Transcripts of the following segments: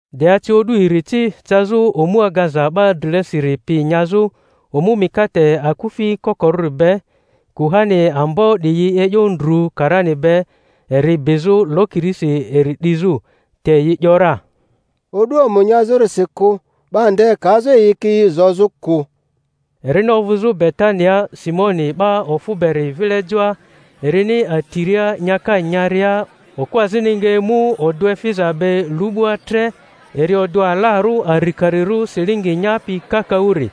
De ace o'du iri ci cazᴜ omu agaza 'ba drilesiri pi nyazᴜ, omu mikate akufi kokorᴜri be; kuhani ambo 'diyi e'yo ndru karani be eri bizᴜ lokirisi eri 'dizᴜ. Te yi 'yora, O'du omu nyazᴜrisi kᴜ, 'ba nde kazᴜ iyikiyi zozᴜ kᴜ. Erini ovᴜzᴜ Betania Simoni 'ba ofᴜ beri vile joa, erini atiria nyaka nyaria, okᴜ azini nga emu odᴜ efiza be lu'bua tre, eri odᴜ alarᴜ arikarirᴜ silingi nyapi kakaᴜri;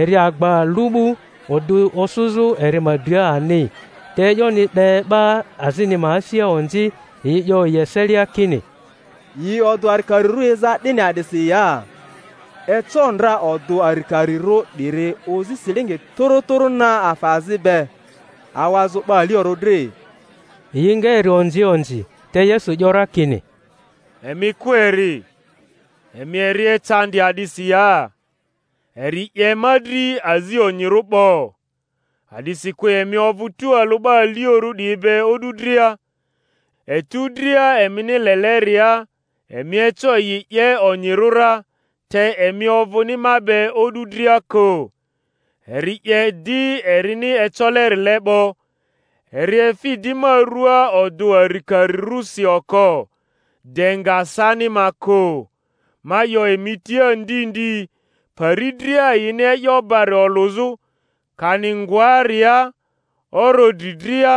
eri agba lu'bu, odᴜ osᴜzᴜ eri ma dria ani. Te e'yoni 'de 'ba azini ma asia onzi, yi 'yo yi eselia kini, Yi odᴜ arikarirᴜ eza 'dini a'disi ya? eco ndra odᴜ arikarirᴜ 'diri ozi silingi tᴜrᴜ tᴜrᴜ na afa azi be, awazᴜ 'ba aliorᴜ dri. Yi nga eri onzi onzi. Te Yesu 'yo ra kini, Emi kᴜ eri; emi eri ecandi a'disi ya? Eri 'ye ma dri azi onyirᴜ 'bo. A'disikᴜ emi ovᴜ tᴜalᴜ 'ba aliorᴜ 'diyi be o'du dria, etu dria emini leleria emi eco yi 'ye onyirᴜ ra; te emi ovᴜni ma be o'du dria kᴜ. Eri 'ye di erini ecolerile 'bo; eri efi di ma rua odᴜ arikarirᴜsi oko, de nga sani ma kᴜ. Ma 'yo emi tia ndi ndi, pari dria yini e'yo bari olᴜzᴜ, kani ngoaria oro dri dria,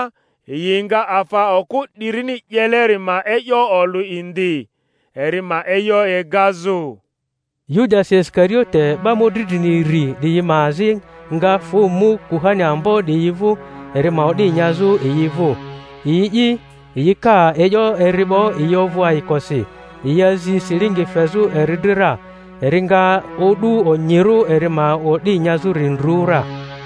yi nga afa okᴜ 'dirini 'yeleri ma e'yo olᴜ indi, eri ma e'yo egazᴜ. Yudasi Isikariote, 'ba mᴜdri drini iri 'diyi ma azi, nga fᴜ mu kuhani ambo 'diyi vᴜ, eri ma o'di nyazᴜ yi vᴜ. Yi'i, yi ka e'yo eri 'bo, yi ovᴜ ayikosi, yi azi silingi fezᴜ eri dri ra. Eri nga o'du onyirᴜ eri ma o'di nyazᴜri ndru ra.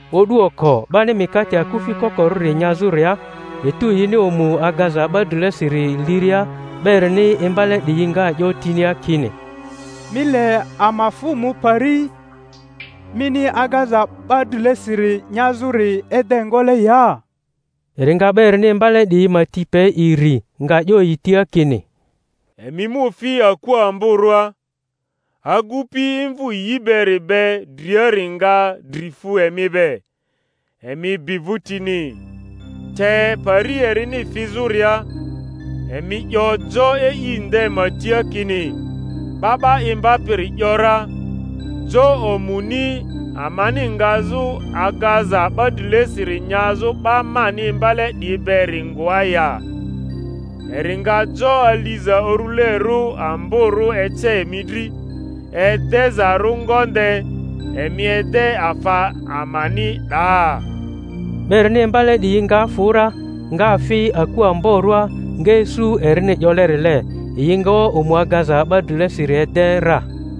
O'du oko 'bani mikate akufi kokorᴜri nyazᴜria, etu yini omu agaza 'ba drilesiri liria, 'ba erini imbale 'diyi nga 'yo tinia kini, Mi le ama fᴜ mu pari mini agaza 'ba drilesiri nyazᴜri ede ngole ya? Eri nga 'ba erini imbale 'diyi ma ti pe iri, nga 'yo yi tia kini, Emi mu fi aku amborᴜa, agupi imvᴜ yi beri be driari nga dri fu emi be; emi bi vᴜtini, te pari erini fizᴜria, emi 'yo jo e'i nde ma tia kini, 'Ba 'ba Imbapiri ‘yora, Jo omuni amani ngazᴜ agaza 'ba drilesiri nyazᴜ 'ba mani imbale 'diyi beri ngoa ya? Eri nga jo aliza urulerᴜ amborᴜ ece emi dri, edezarᴜ ngonde; emi ede afa amani 'daa. 'Ba erini imbale 'diyi nga fᴜ ra, nga fi aku amborᴜa, nga isu erini 'yolerile; yi nga omu agaza 'ba drilesiri ede ra.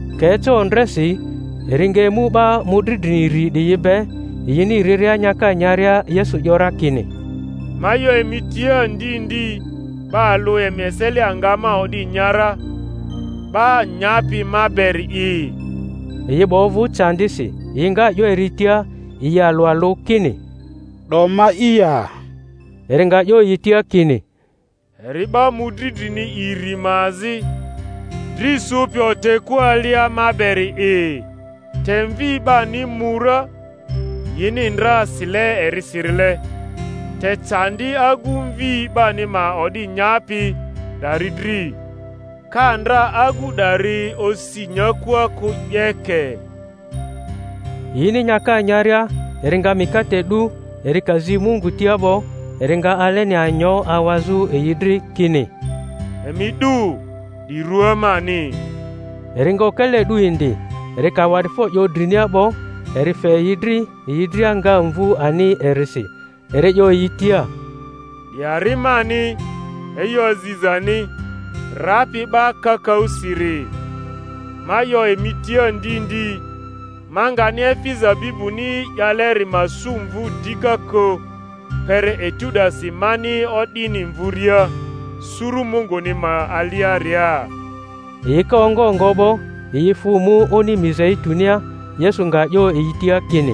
Ka eca ondresi, eri nga emu 'ba mᴜdri drini iri 'diyi be. Yini riria nyaka nyaria, Yesu 'yo ra kini, Ma 'yo emi tia ndi ndi 'ba alᴜ emi eselia nga ma o'di nya ra, ‘ba nyapi ma beri'i. Yi 'ba ovᴜ candisi, yi nga 'yo eri tia, yi alᴜ alᴜ, kini, 'Do ma'i ya? Eri nga 'yo yi tia kini, Eri 'ba mᴜdri drini iri ma azi, dri sᴜpi otekua alia ma beri'i. Te Mvi 'bani mu ra, yini ndra sile erisirile, te candi agu Mvi 'bani ma o'di nyapi 'dari dri! Ka ndra agu 'dari osi nyakua kᴜ 'yeke. Yini nyaka nyaria eri nga mikate 'du, eri ka zi Mungu tia 'bo, eri nga aleni anyo awazᴜ yi dri, kini, Emi 'du; 'di rua mani. Eri nga okele 'du indi, eri ka awa'difo 'yo drinia 'bo, eri fe yi dri, yi dria nga mvu ani erisi. Eri 'yo yi tia, Di ari mani e'yo azizani, rapi ‘ba kakaᴜsiri. Ma 'yo emi tia ndi ndi, ma ngani efi zabibuni 'yaleri ma su mvu dika kᴜ, kpere etu 'dasi mani o'dini mvuria suru Munguni ma aliaria. Yi ka ongo ngo 'bo, yi fᴜ mu oni Mizeitunia. Yesu nga 'yo yi tia kini,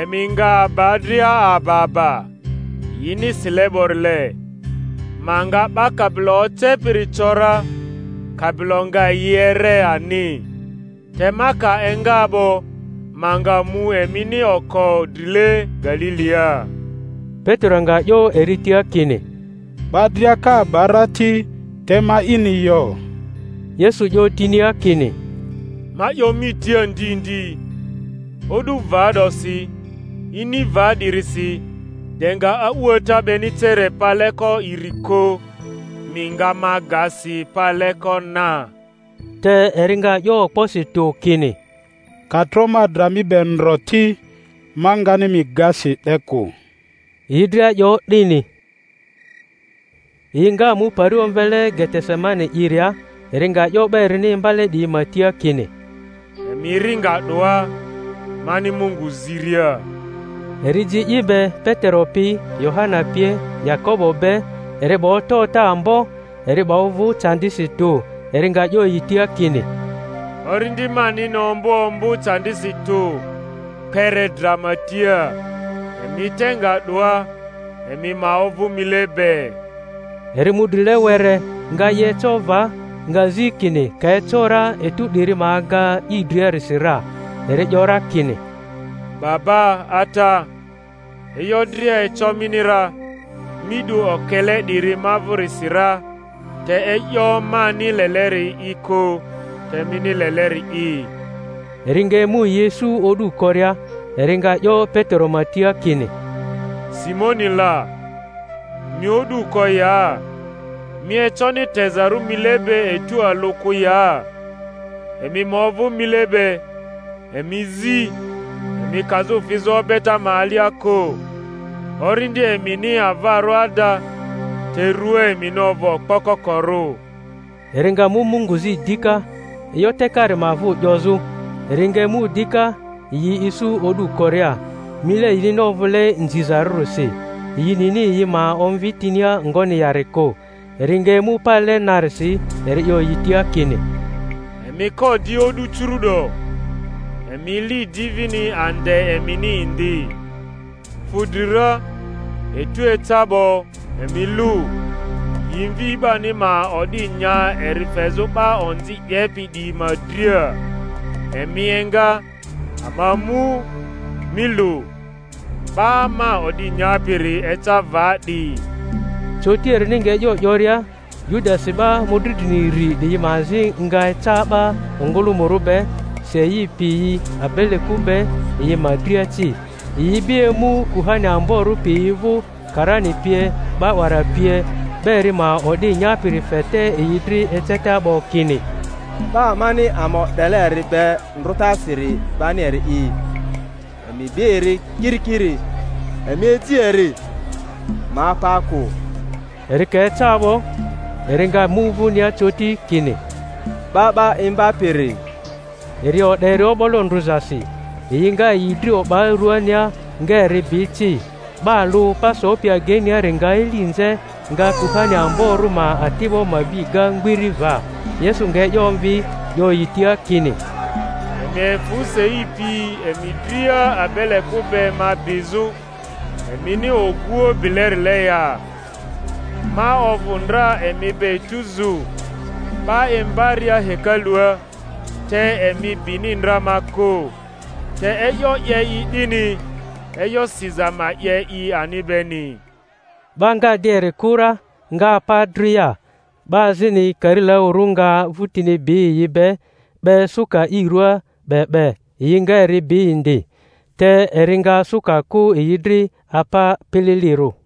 Emi nga aba dria aba aba; yini sile 'borile, Ma nga 'ba kabilo ocepiri co ra, kabilo nga yi ere ani. Te ma ka enga 'bo, ma nga mu emini oko drile Galilia. Petero nga 'yo eri tia kini, 'Ba dria ka aba ra ti, te ma'ini yo. Yesu 'yo tinia kini, Ma 'yo mi tia ndi ndi, o'du va 'dosi, ini va 'dirisi, de nga a'uata 'beni cere paleko iri kᴜ, mi nga ma ga si paleko na. Te eri nga 'yo okposi tᴜ kini, Ka tro ma dra mi be ndro ti, ma ngani mi ga si 'de kᴜ. Yi dria 'yo 'dini. Yi nga mu pari omvele Getesemani iria; eri nga 'yo 'ba erini imbale 'diyi ma tia kini, Emi ri nga 'doa, mani Mungu ziria. Eri ji i be Petero pi, Yohana pie, Yakobo be; eri 'ba ota ota ambo, eri 'ba ovᴜ candisi tᴜ. Eri nga 'yo yi tia kini, Orindi manini ombᴜ ombᴜ candisi tᴜ, kpere dra ma tia; emi te nga 'doa, emi ma ovᴜ mile be. Eri mu drile were, nga i eco va, nga zi kini ka eco ra etu 'diri ma aga i driasi ra. Eri 'yo ra kini, Baba, Ata, e'yo dria eco mini ra; mi 'du okele 'diri ma vᴜrisi ra; te e'yo mani leleri'i kᴜ, te mini leleri'i. Eri nga emu yi isu o'du koria, eri nga 'yo Petero ma tia kini, Simoni la, mi o'du ko ya? Mi econi tezarᴜ mile be etu alᴜ kᴜ ya? Emi ma ovᴜ mile be, emi zi, emi kazᴜ fizᴜ obeta ma alia kᴜ; orindi emini avarᴜ ada, te rua emini ovᴜ okpo kokorᴜ. Eri nga mu Mungu zi dika, e'yo tekari ma vᴜ 'yozᴜ. Eri nga emu dika yi isu o'du koria, mile yinini ovᴜle nzizarᴜrisi; yi nini yi ma omvi tinia ngoni yari kᴜ. Eri nga emu pale narisi, eri 'yo yi tia kini, Emi ko di o'du curu'do, emi li di vini ande emini indi. Fu dri ra, etu eca 'bo; emi lᴜ, yi Mvi 'bani ma o'di nya eri fezᴜ 'ba onzi 'yepi 'diyi ma dria. Emi enga, ama mu; mi lu, 'ba ma o'di nyapiri eca va 'di. Coti, erini nga e'yo 'yoria, Yudasi 'ba mᴜdri drini iri 'diyi ma azi nga eca 'ba ongᴜlᴜmᴜrᴜ be, sei piyi abeleku be yi ma dria ci; yi ibi emu kuhani amborᴜ piyi vᴜ, karani pie, 'ba 'wara pie. 'Ba eri ma o'di nyapiri fe te yi dri eceta 'bo, kini, 'Ba amani ama o'dele eri be ndrᴜtasiri bani eri'i; emi bi eri kirikiri, emi ji eri, ma apa kᴜ. Eri ka eca 'bo, eri nga mu vᴜnia coti, kini, 'Ba 'ba Imbapiri! Eri o'de eri o'bolo ndrᴜzasi. Yi nga yi dri o'ba ruania, nga eri bi ci. 'Ba alᴜ pa sopi ageiniari nga eli nze, nga kuhani amborᴜ ma ati'bo ma bi ga mgbiri va. Yesu nga e'yo omvi, 'yo yi tia kini, Emi efᴜ sei piyi emi dria abeleku be ma bizᴜ, emini oguoᴜ bilerile ya? Ma ovᴜ ndra emi be etuzu, 'ba imbaria hekalua, te emi bini ndra ma kᴜ. Te e'yo 'ye i 'dini, e'yo siza ma 'ye i ani beni. 'Ba nga di eri kᴜ ra, nga apa dria. 'Ba azini karilaᴜrᴜ nga vᴜtini bi yi be, 'be suka i ruaa 'be 'be; yi nga eri bi indi, te eri nga suka kᴜ yi dri, apa pililirᴜ.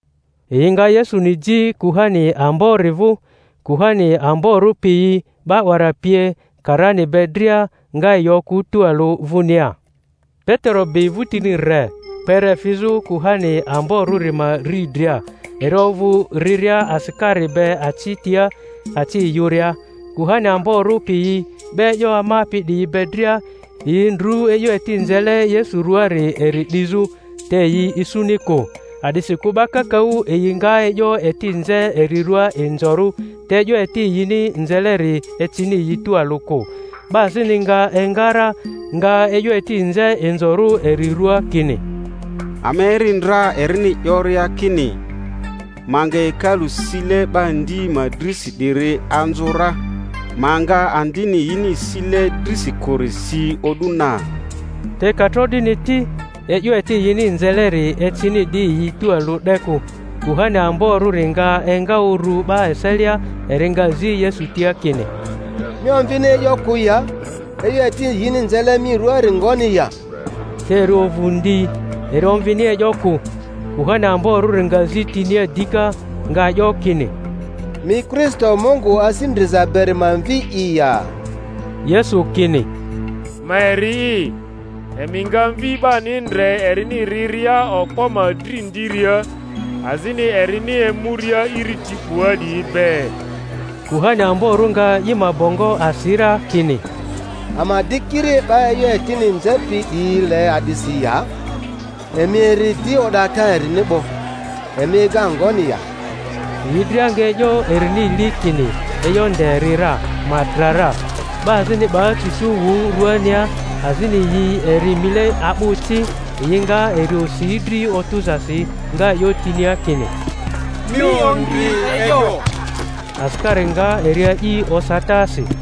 Yi nga Yesuni ji kuhani ambori vᴜ; kuhani amborᴜ piyi, 'ba 'wara pie, karani be dria, nga yi okᴜ tualᴜ vᴜnia. Petero bi vᴜtini re, kpere fizᴜ kuhani amborᴜri ma riidria; eri ovᴜ riria asikari be aci tia, aci yᴜria. Kuhani amborᴜ piyi 'ba e'yo amapi 'diyi be dria, yi ndru e'yo eti nzele Yesu ruaari eri 'dizᴜ; te yi isuni kᴜ. A'disikᴜ 'ba kakaᴜ yi nga e'yo eti nze eri ruaa inzorᴜ, te e'yo eti yini nzeleri ecini yi tualᴜ kᴜ. 'Ba azini nga enga ra, nga e'yo eti nze inzorᴜ eri ruaa kini, Ama eri ndra erini 'yoria kini, Ma nga hekalu sile 'ba ndi ma drisi 'diri anzᴜ ra, ma nga andini yini sile drisi kᴜri si o'du na. Te ka tro 'dini ti, e'yo eti yini nzeleri ecini di yi tualᴜ 'de kᴜ. Kuhani amborᴜri nga enga uru 'ba eselia, eri nga zi Yesu tia kini, Mi omvini e'yo kᴜ ya? E'yo eti yini nzele mi ruaari ngoni ya? Te eri ovᴜ ndi, eri omvini e'yo kᴜ. Kuhani amborᴜri nga zi tinia dika, nga 'yo kini, Mi Kristo Mungu Asi Ndriza beri ma Mvi'i ya? Yesu kini, Ma eri'i; emi nga Mvi 'bani ndre erini riria Okpo ma dri ndiria, azini erini emuria iriti 'bua 'diyi be. Kuhani amborᴜ nga i ma bongo asi ra, kini, Ama di kiri 'ba e'yo etini nzepi 'diyi le a'disi ya? Emi eri di o'data erini 'bo. Emi ega ngoni ya? Yi dria nga e'yo erini li kini e'yo nde eri ra, ma dra ra. 'Ba azini 'ba cucu wᴜ ruania, azini yi eri mile a'bᴜ ci, yi nga eri osi dri otᴜzasi, nga 'yo tinia kini, Mi ondri e'yo! Asikari nga eri a'i osatasi.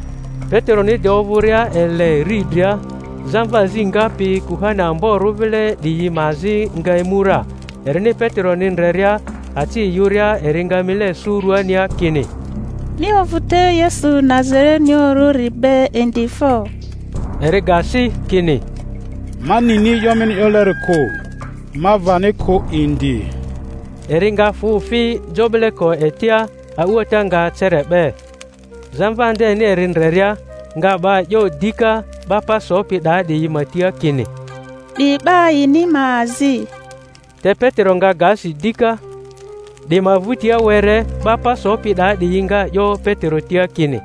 Peteroni de ovᴜria ele riidria, zamva azi ngapi kuhani amborᴜ vile 'diyi ma azi nga emu ra; erini Peteroni ndreria aci yᴜria, eri nga mile sᴜ ruania, kini, Mi ovᴜ te Yesu Nazarenioᴜrᴜri be indi fo! Eri ga si, kini, Ma nini e'yo mini 'yoleri kᴜ, ma vani kᴜ indi. Eri nga fᴜ fi jo 'bileko etia; a'uata nga cere 'be. Zamva ndeni eri ndreria, nga 'ba 'yo dika 'ba pa sopi 'daa 'diyi ma tia kini, 'Di 'ba yini ma azi. Te Petero nga ga si dika. 'Di ma vᴜtia were 'ba pa sopi 'daa 'diyi nga 'yo Petero tia kini,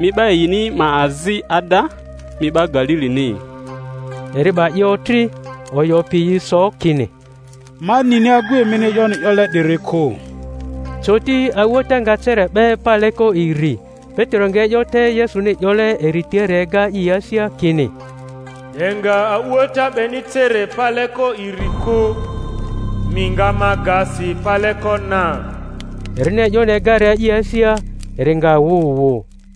Mi 'ba yini ma azi ada; mi 'ba Galilini. Eri 'ba i otri, oyo piyi so kini, Ma nini agu emini e'yoni 'yole 'diri kᴜ. Coti a'uata nga cere 'be paleko iri. Petero nga e'yo te Yesuni 'yole eri tiari ega i asia, kini, De nga a'uata 'beni cere paleko iri kᴜ, mi nga ma ga si paleko na. Erini e'yoni egaria i asia, eri nga wᴜ wᴜ.